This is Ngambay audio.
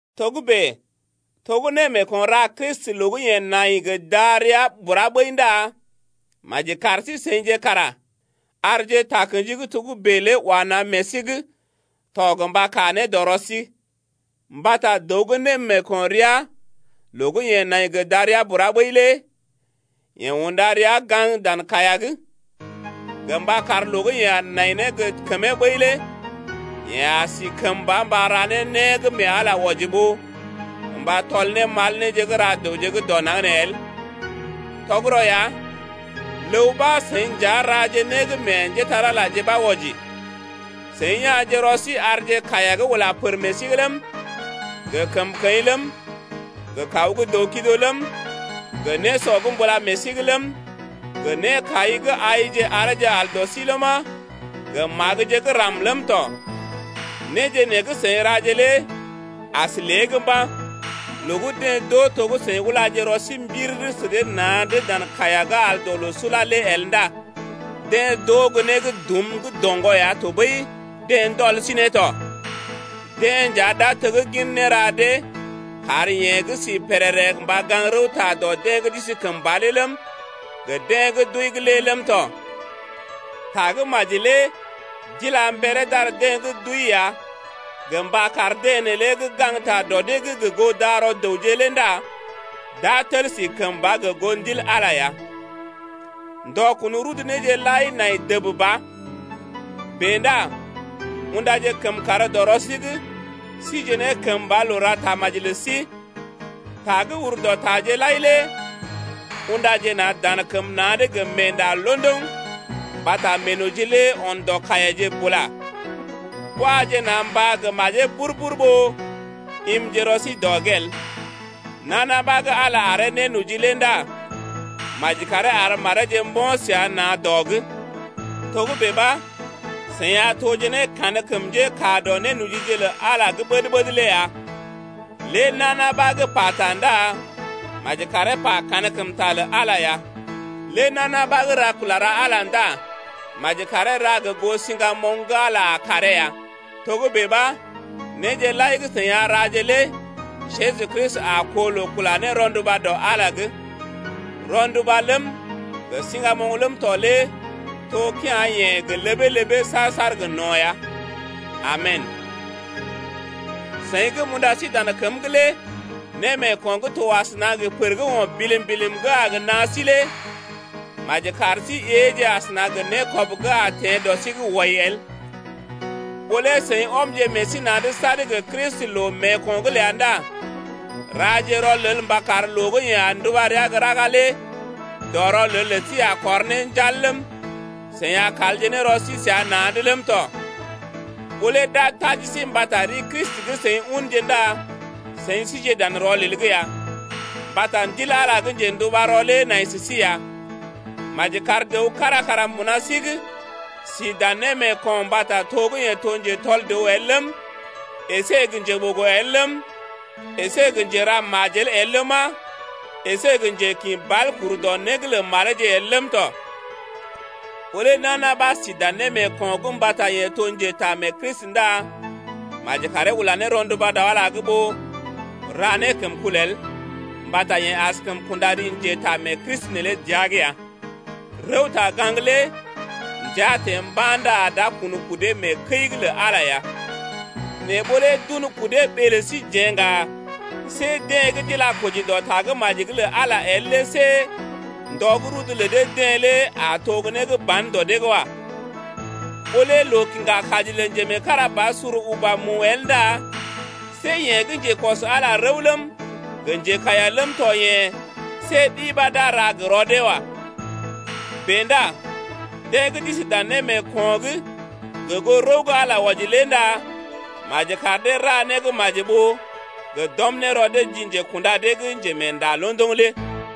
Togə́bè to gə́ némeeko̰ ra Kristi loo gə́ yeḛ nai gə darəa bura ɓəi ndá maji kar sí-seḭje kara arje takə̰ji gə́ togə́bè lé wa na̰ meḛ sí’g tɔ gə mba kaa ne dɔ rɔ sí. Mbata dəw gə́ némeeko̰ rəa loo gə́ yeḛ nai gə darəa bura ɓəi lé yeḛ unda rəa gaŋg dan kaiya’g, gə mba kar loo gə́ yeḛ nai ne gə kəmee ɓəi lé yeḛ a si kəmba mba ra ne né gə́ mee Ala wɔji ɓó gə mba tɔl ne mal néje gə́ ra dəwje gə́ dɔ naŋg nee el. Tɔgərɔ ya, ləw ɓa seḭ nja raje né gə́ meḛ njépole-magəje ɓa wɔji, seḭ ya̰je rɔ sí arje kaiya gə́ ula pər meḛ sí’g ləm, gə kəmkəḭ ləm, gə kaw gə́ dəw-kido ləm, gə nésɔ gə́ mbula meḛ sí’g ləm, gə nékai gə́ aije areeje al dɔ sí ləma, gə magəje gə́ ram ləm tɔ. Néje nee gə́ seḭ raje lé as lée’g mba̰. Loo gə́ deḛ d’oo to gə́ seḭ ulaje rɔ sí mbiriri sə dee na̰’d dan kaiya gə́ al dɔ loo sula lé el ndá deḛ d’oo gə́ né gə́ dum gə́ doŋgɔ ya tɔɓəi deḛ ndɔl sí ne tɔ. Deḛ nja d’a teggin néra dee kar yeḛ gə́ si pèrèrè mba gaŋg rəwta dɔ deḛ gə́ d’isi kəmba lé ləm, gə deḛ gə́ d’wəi’g lé ləm tɔ. Tagə́maji lé d’ila mberee d’ar deḛ gə́ d’wəi ya gə mba kar deḛ neelé gə́ gaŋgta dɔ dee’g gə goo darɔ dəwje lé ndá d’a tel si kəmba gə goo Ndil Ala ya. Ndɔ kun rudu néje lai nai dəb ba. Bèe ndá undaje kəmkàr dɔ sí’g sije ne kəmba loo ra tamaji’g lə sí. Ta gə́ ur dɔ taje lai lé: Undaje na̰ dan kəm na̰’d gə meenda londoŋ mbata meenoji lé ɔn dɔ kaiyaje bula. Waje na̰ mbá gə́ majee bur-bur ɓó imje rɔ sí dɔ’g el. Nana ɓa gə́ Ala aree nénoji lé ndá maji karee ar mareeje mbo̰ səa na̰ dɔ’g. Togə́bè ɓa seḭ a toje ne kankəm njékaa dɔ nénojije lə Ala gə́ ɓəd-ɓəd lé ya. Lé nana ɓa gə́ pata ndá maji karee pa kankəmta lə Ala ya. Lé nana ɓa gə́ ra kula ra Ala ndá maji karee ra gə goo siŋgamoŋ gə́ Ala a karee ya, togə́bè ɓa néje lai gə́ seḭ a raje lé Jeju Kristi a koo loo kula ne rɔnduba dɔ Ala’g tɔ. Rɔnduba ləm, gə siŋgamoŋ ləm tɔ lé to kea̰-yeḛ gə ləbee-ləbee saar-saar gə no̰ ya. Amen. Seḭ gə́ m’unda sí dan kəm’g lé némeeko̰ gə́ to asəna gə pər gə́ o̰ bilim-bilim gə́ a gə naa sí lé maji kar sí éeje asəna gə nékɔb gə́ a teḛ dɔ sí’g wai el. Ɓó lé seḭ ɔmje meḛ sí na̰’d sad gə Kristi loo meeko̰’g ləa ndá raje rɔlel mba kar loo gə́ yeḛ a nduba rəa gə́ raga lé dɔ rɔlel lə sí a kɔr ne njal ləm, seḭ a kalje ne rɔ sí səa na̰’d ləm tɔ. Ɓó lé d’a taji sí mbata ri Kristi gə́ seḭ unje ndá seḭ sije dan rɔlel’g ya, mbata Ndil Ala gə́ njḛdubarɔ lé nai sə sí ya. Maji kar dəw kára kara mbuna sí’g si dan némeeko̰’g mbata to gə́ yeḛ to njetɔl dəw el ləm, əsé gə́ njeɓogo el ləm, əsé gə́ njera majel el ləma, əsé gə́ njekḭ bal kur dɔ né lə mareeje’g el ləm tɔ. Ɓó lé nana ɓa si dan némeeko̰’g mbata yeḛ to njetaamee-Kristi ndá maji karee ula ne rɔnduba dɔ Ala’g ɓó ra ne kəmkul el, mbata yeḛ askəm kunda ri njetaamee-Kristi neelé dəa’g ya. Rəwta-gaŋg lé ndəa teḛ mba̰ ndá d’a kun kudee mee kəi’g lə Ala ya. Nɛ ɓó lé d’un kudee ɓee lə síjeḛ ŋga, see deḛ gə́ d’ila koji dɔ Tagə́maji’g lə Ala el lé see ndɔ gə́ rudu lə dee-deḛ lé a to né gə́ ban dɔ dee’g wa. Ɓó lé loo kiŋga kaji lə njemeekarabasur uba mu el ndá see yeḛ gə́ njekɔs-ala-rəw ləm, gə njekaiya ləm tɔ yḛ̀, see ɗi ɓa d’a ra gə rɔ dee wa. Bèe ndá deḛ gə́ d’isi dan némeeko̰’g gə goo rəw gə́ Ala wɔji lé ndá maji kar dee ra né gə́ maji, ɓó gə d’ɔm ne rɔ dee ji njekunda dee’g gə́ Njemeenda londoŋ lé.